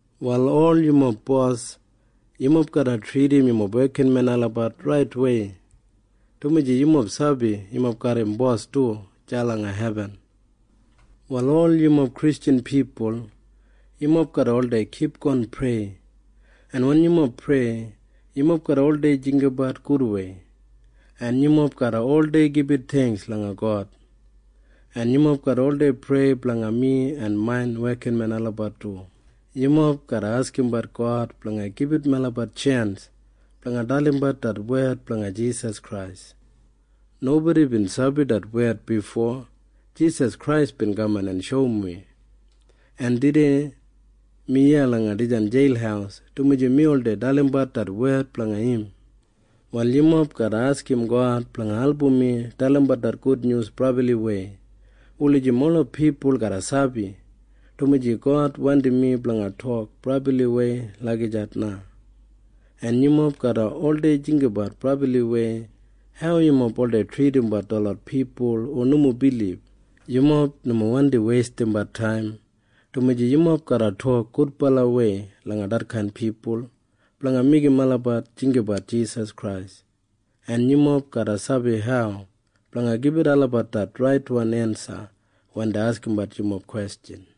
Wal ol yumob bos, yumob garra tridim yumob wekinmen olabat raitwei, dumaji yumob sabi yumob garram Bos du deya langa hebin. Prayer Wal ol yumob Kristjan pipul, yumob garra oldei kipgon prei. En wen yumob prei, yumob garra oldei jinggabat gudwei, en yumob garra oldei gibit theingks langa God. En yumob garra oldei prei blanga mi en main wekinmen olabat du. Yumob garra askimbat God blanga gibit melabat tjens blanga dalimbat det wed blanga Jisas Krais. Nobodi bin sabi det wed bifo Jisas Krais bin kaman en shoum wi. En tudei mi iya langa dijan jeil dumaji mi oldei dalimbat det wed blanga im. Wal yumob garra askim God blanga album mi dalimbat det gudnyus brabliwei wulijim ola pipul garra sabi, dumaji God wandim mi blanga tok brabliwei lagijat na. En yumob garra oldei jinggabat brabliwei hau yumob oldei tridimbat detlot pipul hu nomo bilib. Yumob nomo wandi weistimbat taim, dumaji yumob garra tok gudbalawei langa detkain pipul blanga meigim olabat jinggabat Jisas Krais, en yumob garra sabi hau blanga gibit olabat det raitwan ensa wen dei askimbat yumob kwestjan.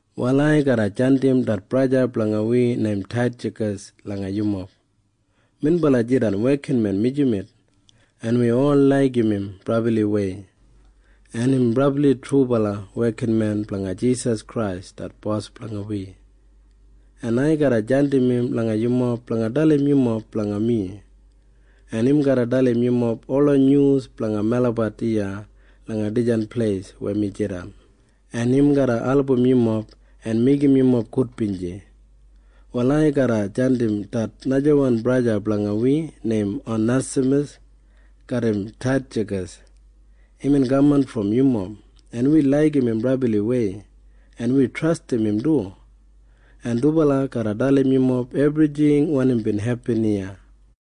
Wal ai garra jandim det braja blanga wi neim Titjakas langa yumob. Minbala jidan wekinmen mijamet, en wi ol laigim im brabliwei, en im brabli trubala wekinmen blanga Jisas Krais det Bos blanga wi. En ai garra jandim im langa yumob blanga dalim yumob blanga mi, en im garra dalim yumob ola nyus blanga melabat iya langa dijan pleis weya mi jidan, en im garra album yumob en meigim yumob gudbinji. Wal ai garra jandim det najawan braja blanga wi neim Onesamas garram Titjakas. Imbin kaman brom yumob, en wi laigim im brabliwei, en wi trastim im du. En dubala garra dalim yumob ebrijing wanim bin hepin iya.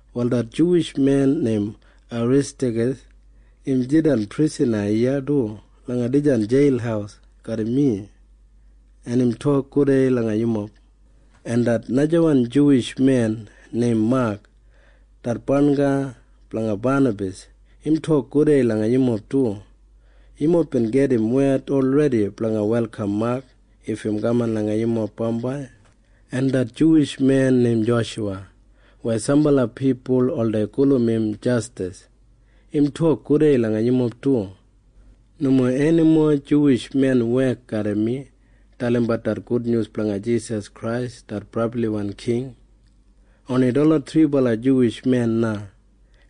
Wal det Juwish men neim Aristakas im jidan prisana iya du langa dijan jeil garram mi, en im tok gudei langa yumob. En det najawan Juwish men neim Mak det barnga blanga Banabas im tok gudei langa yumob du. Yumob bin gedim wed olredi blanga welkam Mak if im kamat langa yumob bambai. En det Juwish men neim Joshuwa weya sambala pipul oldei gulum Jastas im tok gudei langa yumob du. Nomo enimo Juwish men wek garram mi dalimbat det gudnyus blanga Jisas Krais det brabliwan King. Oni detlot thribala Juwish men na,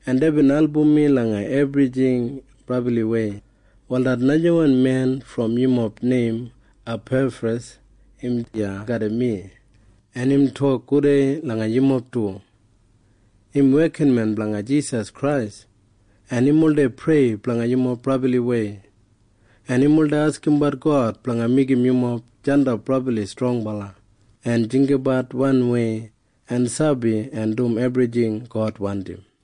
en deibin album mi langa ebrijing brabliwei. Wal det najawan men brom yumob neim Apefras im iya garram mi, en im tok gudei langa yumob du. Im wekinmen blanga Jisas Krais, en im oldei prei blanga yumob brabliwei, en im oldei askimbat God blanga meigim yumob jandap brabli strongbala en jinggabat wanwei en sabi en dum ebrijing God wandim.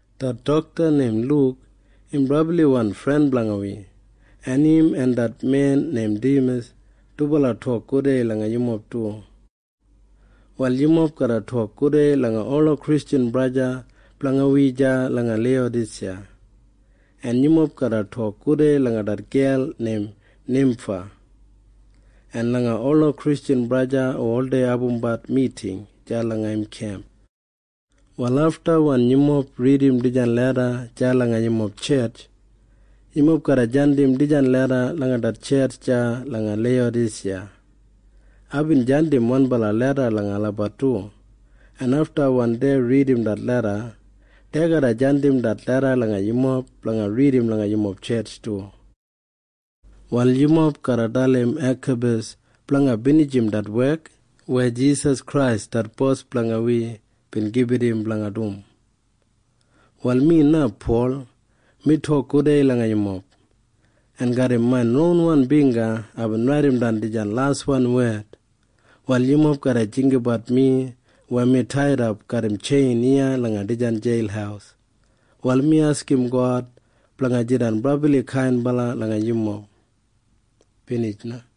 Det dokta neim Luk im brabliwan fren blanga wi, en im en det men neim Dimas dubala tok gudei langa yumob du. Wal yumob garra tok gudei langa ola Kristjan braja en sista blanga wi deya langa Leiyadasiya, en yumob garra tok gudei langa det gel neim Nimfa en langa ola Kristjan braja en sista olabat hu oldei abumbat miting deya langa im kemp. Wal afta wen yumob ridim dijan leda deya langa yumob tjetj, yumob garra jandim dijan leda langa det tjetj deya langa Leiyadasiya. Aibin jandim wanbala leda langa olabat du, en afta wen dei ridim det leda, dei garra jandim det leda langa yumob blanga ridim langa yumob tjetj du. Wal yumob garra dalim Akapas blanga binijim det wek weya Jisas Krais det Bos blanga wi bin gibit im blanga dum. Wal mi na, Pol, mi tok gudei langa yumob. En garram main ronwan bingga aibin raidimdan dijan laswan wed. Wal yumob garra jinggabat mi weya mi taidap garram tjein iya langa dijan jeil. Wal mi askim God blanga jidan brabli kainbala langa yumob. Binij na.